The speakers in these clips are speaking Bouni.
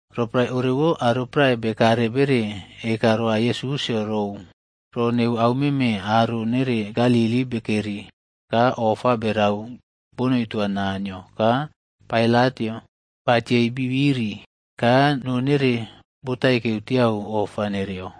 Roporae orewo, aro prae bekare bere eka roa Yesusꞌyo rou ro neu au meme aro nere Galili bekeri ka ofa berau bonoi toa Naniyo ka Pailatꞌyo batiei bi biri ka noo nere botaikeu tiau ofa nereyo.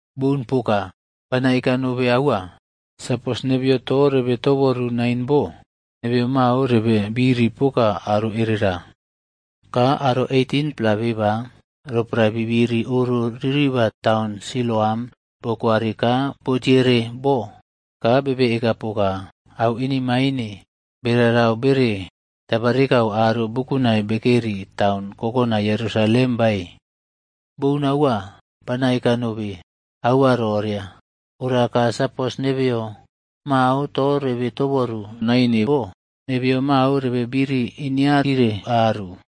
Boun poka. Bana eka nobe aua. Sapos nebeyo to rebe toboru nain bo, nebeyo mao rebe biri poka aro erera. Ka aro 18-pla beba, roporae bibiri oro ririba taun Siloam bokwari ka botiere bo ka bebe eka poka au inemaine bererau bere tabarikau aro bukunai bekeri taun kokonai Yerusalem bae? Boun aua, bana eka nobe aua roria. Ora ka sapos nebeyo mao to rebe toboru naine bo, nebe mao rebe biri inearire aru.”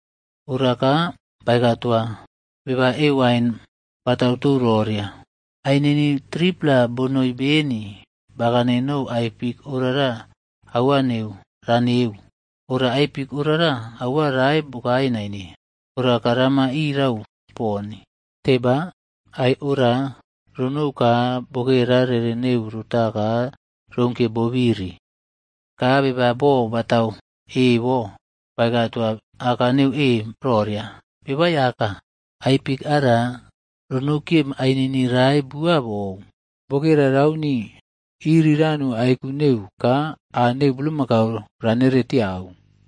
Ora ka baeka toa beba e wain batau tou roria, ‘Ainini 3-pla bonoi beni bakane nou ai fik orara auwa neu raneu, ora ai fik orara aua rae bokae naine. Ora ka rama irau poni. Teba, ai ora ronou ka bokera rere neu rota ka rounkiye bobiri.’ Ka beba bo batatau e bo baeka toa aka neu e roria, ‘Beba Aiyaka, ai fik ara ronou kiye ainini rae bua bou. Bokera rauni iriranu aiku neu ka aa neu bulmakau ranere tiau.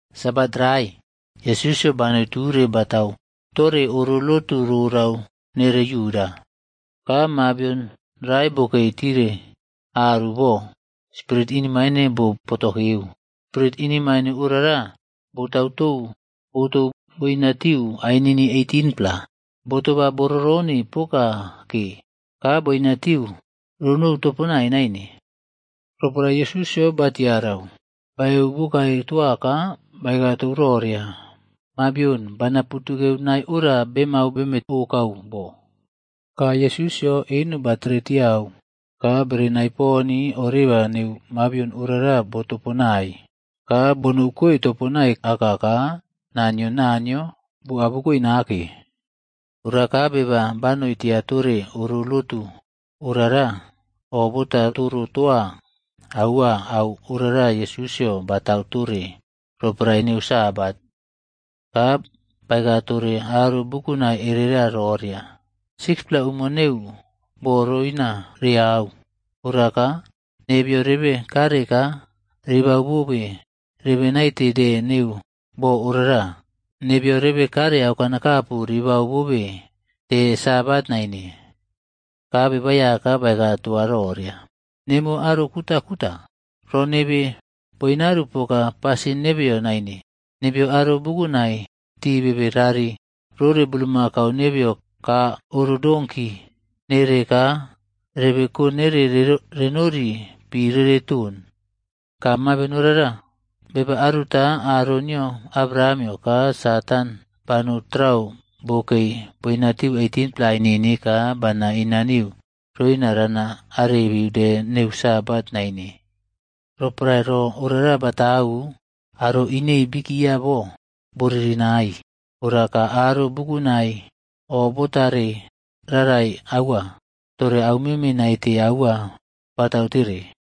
Sabat rae, Yesusꞌyo banoi ture batau tore oro lotu rorau nere Yuda. Ka mabion rae bokei tire aru bo, spirit inemaine bo potokeu. Spirit inemaine orara botauꞌtou botou boina tiu ainini 18-pla. Bo toba boꞌrorone poka ke ka boinatiu ronou toponai naine. Roporae Yesusꞌyo batiarau, baeu bokae toa ka baeka tou roria, “Mabion, bana putukeu nae ora bemau beme okau bo.” Ka Yesusꞌyo eno batere tiau ka berenai poni oreba neu mabion orara botoponai ka bonoukoi toponai aka ka naa nio Naniyo bo abukoe nake. Ora ka beba banoi tia tore oro lotu orara o bota toro toa aua au orara Yesusꞌyo batau tore roporae neu Sabat. Ka baeka tore aro bukunai erera roria, “6-pla umo neu boo roina reau. Ora ka nebeyo rebe kare ka ribau bobe rebe naite de neu bo orara. Nebeyo rebe kare aukanakapu ribau bobe de sabat naine.” Ka Beba Aiyaka baeka toa roria, “Nemuwo aro kutakuta. Ro nebe boinaru poka pasin nebeyo naine. Nebeyo aro bukunai ti bebe rari rore bulmakau nebeyo ka oro donki nere ka rebe ko nere renori pi rere ton. Ka mabion orara, beba aruta aro nio Abrahamꞌyo ka Satan banou trau bokei boinatiu 18-pla ainini ka bana inaniu roina rana arebiu de neu sabat naine?” Roporae ro ora batau, aro inei bikia bo, bo ririnaii. Ora ka aro bukunai o botare rarai aua tore aumeme naite aua batau tere.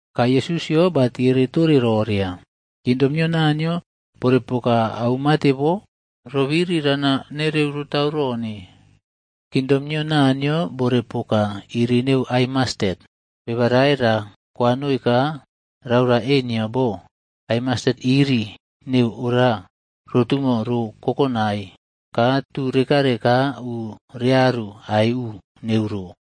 Ka Yesusꞌyo batiere tore roria, “Kingdom nio Naniyo bore poka au mate bo? Ro biri rana nereu rotau rone? Kingdom nio Naniyo bore poka iri neu ai mastet,a beba rae ra kwanoi ka raora e nio bo ai mastet iri neu ora rotumo ro kokonai ka tu rekare ka u rearu aiꞌu neu ro.”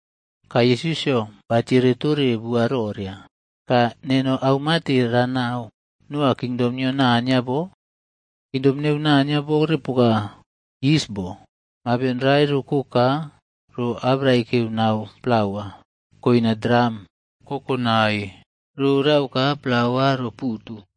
Ka Yesusꞌyo batiere tore bua roria, “Ka neno au mate ranau noa kingdom nio Naniyo bo? Kingdom neu Naniyo bore poka yis bo, mabion rae roko ka ro abraikeu nau plauab koina dram kokonai rorau ka plaua ro putu.”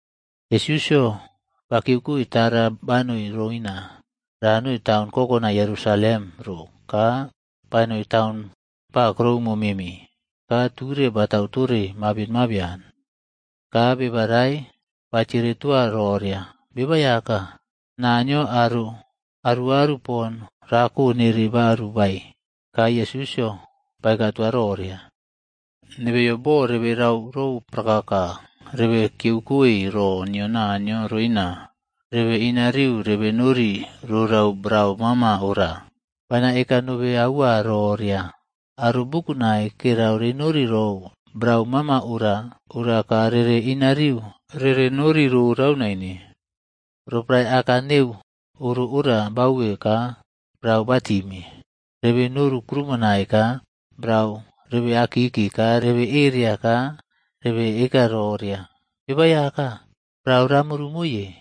Yesusꞌyo ba kiyeukoe tara banoi roina ranoi taun kokonai Yerusalem ro ka banoi taun ba kuroumo meme, ka ture batau tore mabion mabian. Ka beba rae batiere toa roria, “Beba Aiyaka, Naniyo aro aruꞌaru pon rako nere baru bae?” Ka Yesusꞌyo baeka tore roria, “Nebeyo boo rebe rau rou prakaka rebe kiyeukoe ro nio Naniyo roina rebe inariu rebenori rorau brau mama ora. Bana eka nobe aua roria, aro bukunai kerau renori rou brau mama ora, ora ka rere inariu rere nori rorau naine. Roporae aka neu oro ora bauwe ka brau batime, rebe noru krumonai ka brau rebe akiki ka rebe eria ka rebe eka roria, ‘Beba Aiyaka, brau ramuru moiye.’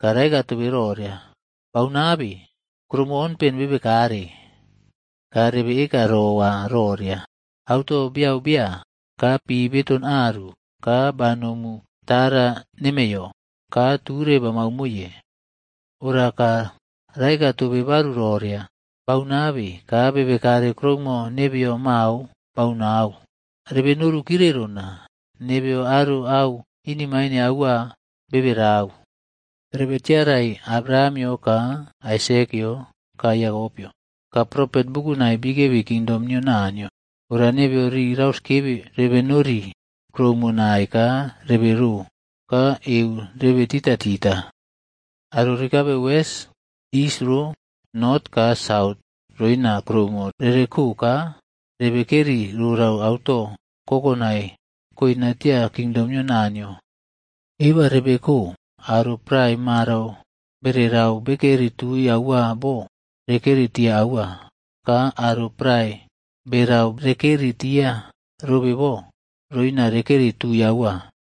Ka raeka tobe roria, ‘Baunabe, kuroumo onpen bebekare.’ “Ka rebe eka rowa roria, ‘Auto beyau bea ka pi beton aru ka banomu tara nemeiyo ka ture bamau moiye.’ “Ora ka raeka tobe baru roria, ‘Baunabe ka bebekare kuroumo nebeyo mao baunau. Rebe noru kirerona, nebeyo aro au inemaine aua bebe rau.’ “Rebe tiarai Abrahamꞌyo ka Aisekꞌyo ka Yakopꞌyo ka propet bukunai bikebi kingdom nio Naniyo. Ora nebeyo rii rauskebe rebe nori kuroumo nai ka rebe roo ka eu rebe titaꞌtita. Aro rekare wes, is ro, not ka saut roina kuroumo rereko ka rebe keri rorau auto kokonai koina tia kingdom nio Naniyo. Eba rebeko aro prae marau bere rau bekeri tui aua bo, rekeri tia aua ka aro prae berau rekeri tia robe bo roina rekeri tiu aua.”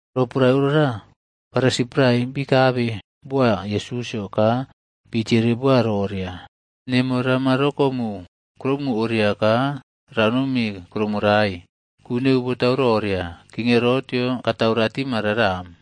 Roporae orara, Farisi prae bikabe boa Yesusꞌyo ka bii tiere boa roria, “Nemo rama rokomu kuroumo oria ka ranomi kuroumo rae, ku neu botau roria, King Herotꞌyo katau ratima raram.”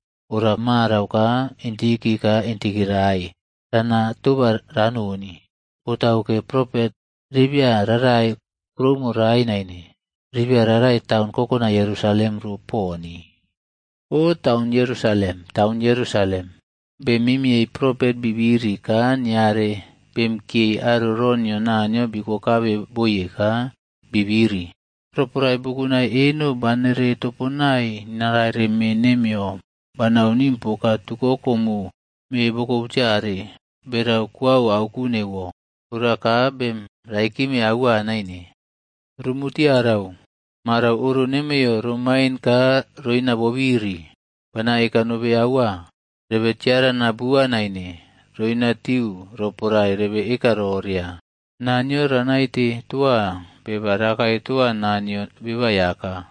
Ora marau ka intiki ka intiki rae rana toba ranoni, botauke, propet ribia rarai kuroumo rae naine, ribia rarai taun kokonai Yerusalem ro poni. “O taun Yerusalem, Taun Yerusalem, bem mimiyei propet bi biri ka niare bemꞌkiyei aro ro nio Naniyo bikokabe boye ka bi biri. Roporae bukunai eno banere toponai naraire me nemiyo banau nim poka tukoko mo me bokobutiare berau kuau auku neuwo. Ora ka bem raikime aua naine. Rumu tiarau. Marau oro nemiyo romain ka roina bobiri. Bana eka nobe aua, rebe tiarana bua naine roinatiu roporae rebe eka roria, ‘Naniyo ranaite toa beba rakae toa naa nio Beba Aiyaka.’”